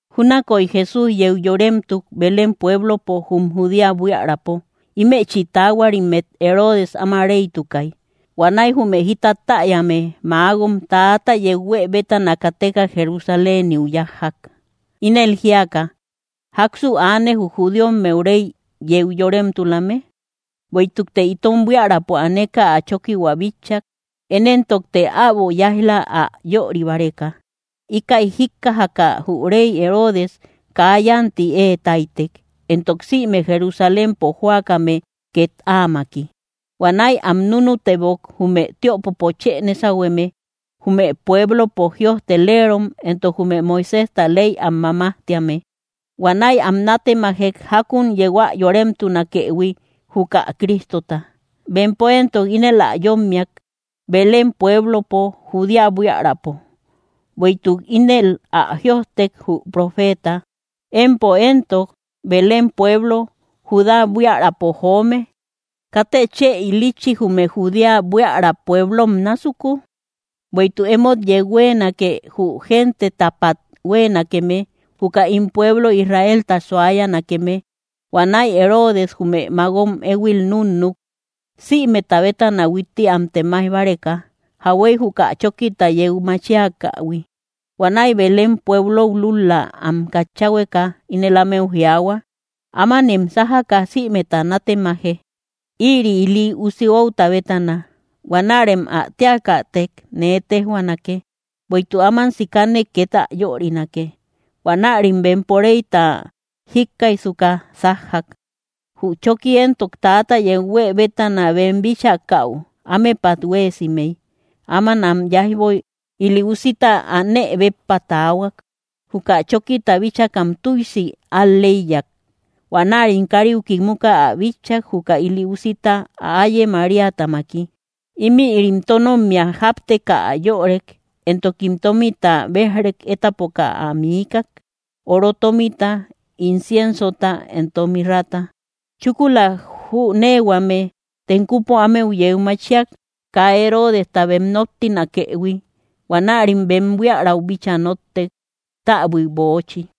Júnakoy Jesús yeu yoremtuk Belén pueblopo jum Judea buiärapo, ímechi taahuarimmet Herodes áma réytukay. Huanäi jume jita täyame magom täata yeu huë bétana kateka Jerusaléniu yájjak, ínel jíaka: —¿Jáksu aane, jü judíommeu réy yeu yoremtulame? Bueïtukte itom buiärapo aneka ä chókihua bitchak, én éntokte äbo yáij‑la ä yöri báreka. Íkäi jíkkajaka, jü réy Herodes kaa yánti ée táytek, entok sïme Jerusalénpo jóakame két áamaki. Huanäi am núnutebok jume tiöpopo chë nésahueme, jume pueblopo jïojteleerom entok jume Moiséjta ley am mamajtíame. Huanäi am nátemajek jákun yeu ä yoremtunakëhui, juka Cristota. Bempo éntok ínel ä yómmiak: —Belén pueblopo Judea buiärapo; bueïtuk ínel ä jïojtek, jü profeeta: Empo éntok, Belén pueblo, Judá buiärapo joome, katë chë ilitchi, jume Judea buiära pueblom násuku; bueïtuk emót yeu huéenake, jü gentetapat huéenakeme, juka ín pueblo Israelta suayanakeme. Huanäi Herodes jume magom éhuil núnnuk, sïmeta bétana huitti am temaij báreka, jauhuey juka chókita yeu machiakähui. Huanäi Belén pueblou lúl‑la am katchahueka, ínel ámeu jiaahua: —Ámanem sájaka sïmeta nátemaje, ïri ili usi outa bétana. Huanärem ä téakätek nee téjhuaanake, bueïtuk áman sikane két ä yörinake. Huanärim bempo réyta jíkkaijsuka sájjak. Jü chóki éntok täata yeu huë bétana bem bíchakäu ámepat huéesimey. Áman am yáijboy ili usita anë béppa taahuak. Juka chókita bíchakam tüisi al‑lëiyak. Huanärim káriu kimuka ä bitchak. Juka ili usita ä áye Maríatamaki. Ímïrim tónommia jápteka ä yörek, entokim tómita béjrek étapoka ä miikak, oro tómita, inciensota entok mirrata. Chúkula jüneehuame tenkupo ámeu yeu machiak, kaa Herodestau bem nóttinakëhui. Huanärim bem buiärau bíchaa nóttek täbui böochi.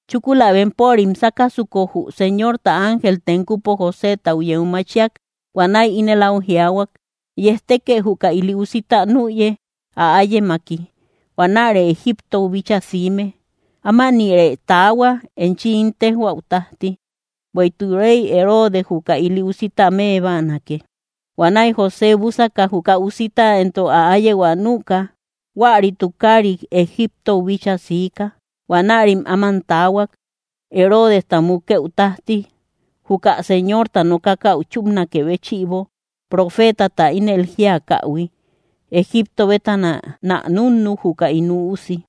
Chúkula bempörim sákasuko, jü Señorta ángel tenkupo Josétau yeu machiak. Huanäi ínel áu jiaahuak: —Yejtekë juka ili usita nüye, ä áyemaki. Huanäre Egiptou bíchaa siime. Ámanïrë taahua, enchi ín téjhuäu tájti; bueïtuk rey Herodes juka ili usita më báanake. Huanäi José búsaka, juka usita entok ä áyehua nüka, huäri tukaarit Egiptou bíchaa siika. Huanärim áman taahuak, Herodesta mukëu tájti, juka Señorta nokakäu chúpnakë béchïbo, profeetata ínel jíakähui: “Egipto bétana nä núnnuk, juka ín Üusi.”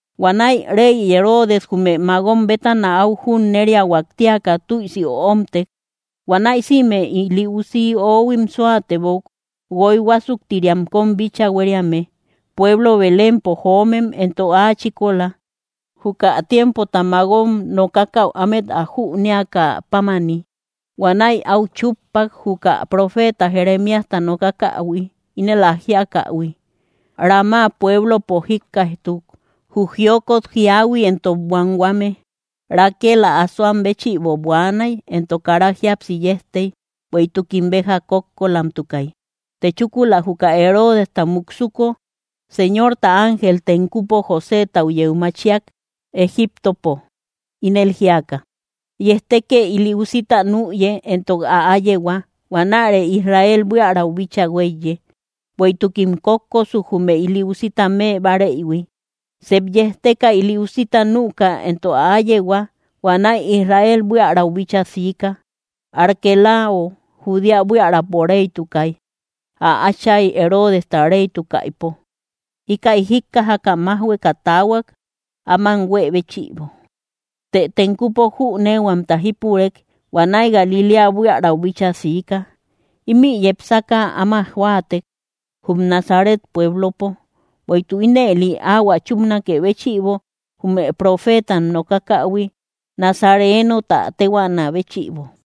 Huanäi rey Herodes jume magom bétana áu junneriahuak tíaka tüisi öomtek. Huanäi sïme ili usi ohuim súatebok, guoy huásuktiriam kóm bíchaa huériame, pueblo Belémpo joomem entok áa chíkola, juka tiempota magom nokakäu ámet ä jüneakä pámani. Huanäi áu chúppak, juka profeeta Jeremíasta nokakähui, ínel ä jíakähui: Ramá pueblopo jíkkaijtuk, jü jiokot jíahui entok buanhuame: Raquel ä asoam béchïbo buaanay, entok kara jíapsi yejtey, bueïtukim béja kókkolamtukay. Të chúkula juka Herodesta muksuko, Señorta ángel tenkupo Josétau yeu machiak Egíptopo, ínel jíaka: —Yejtekë ili usita nüye, entok ä áyehua. Huanäre Israel buiärau bíchaa huéiye, bueïtukim kókkosuk, jume ili usita më báreïhui. Sep yejteka, ili usita nüka, entok ä áyehua. Huanäi Israel buiärau bíchaa siika. Arquelao Judea buiärapo réytukay, ä áchay Herodesta réytukaïpo. Íkäi jíkkajaka májhueka taahuak, áman huée béchïbo. Të tenkupo jüneehuamta jípurek; huanäi Galiléa buiärau bíchaa siika. Ímï yepsaka áma jóatek, jum Nazaret pueblopo, bueïtuk ínëli áhuä chúpanakë béchïbo, jume profeetam nokakähui, nazareeno tä téhuaanä béchïbo.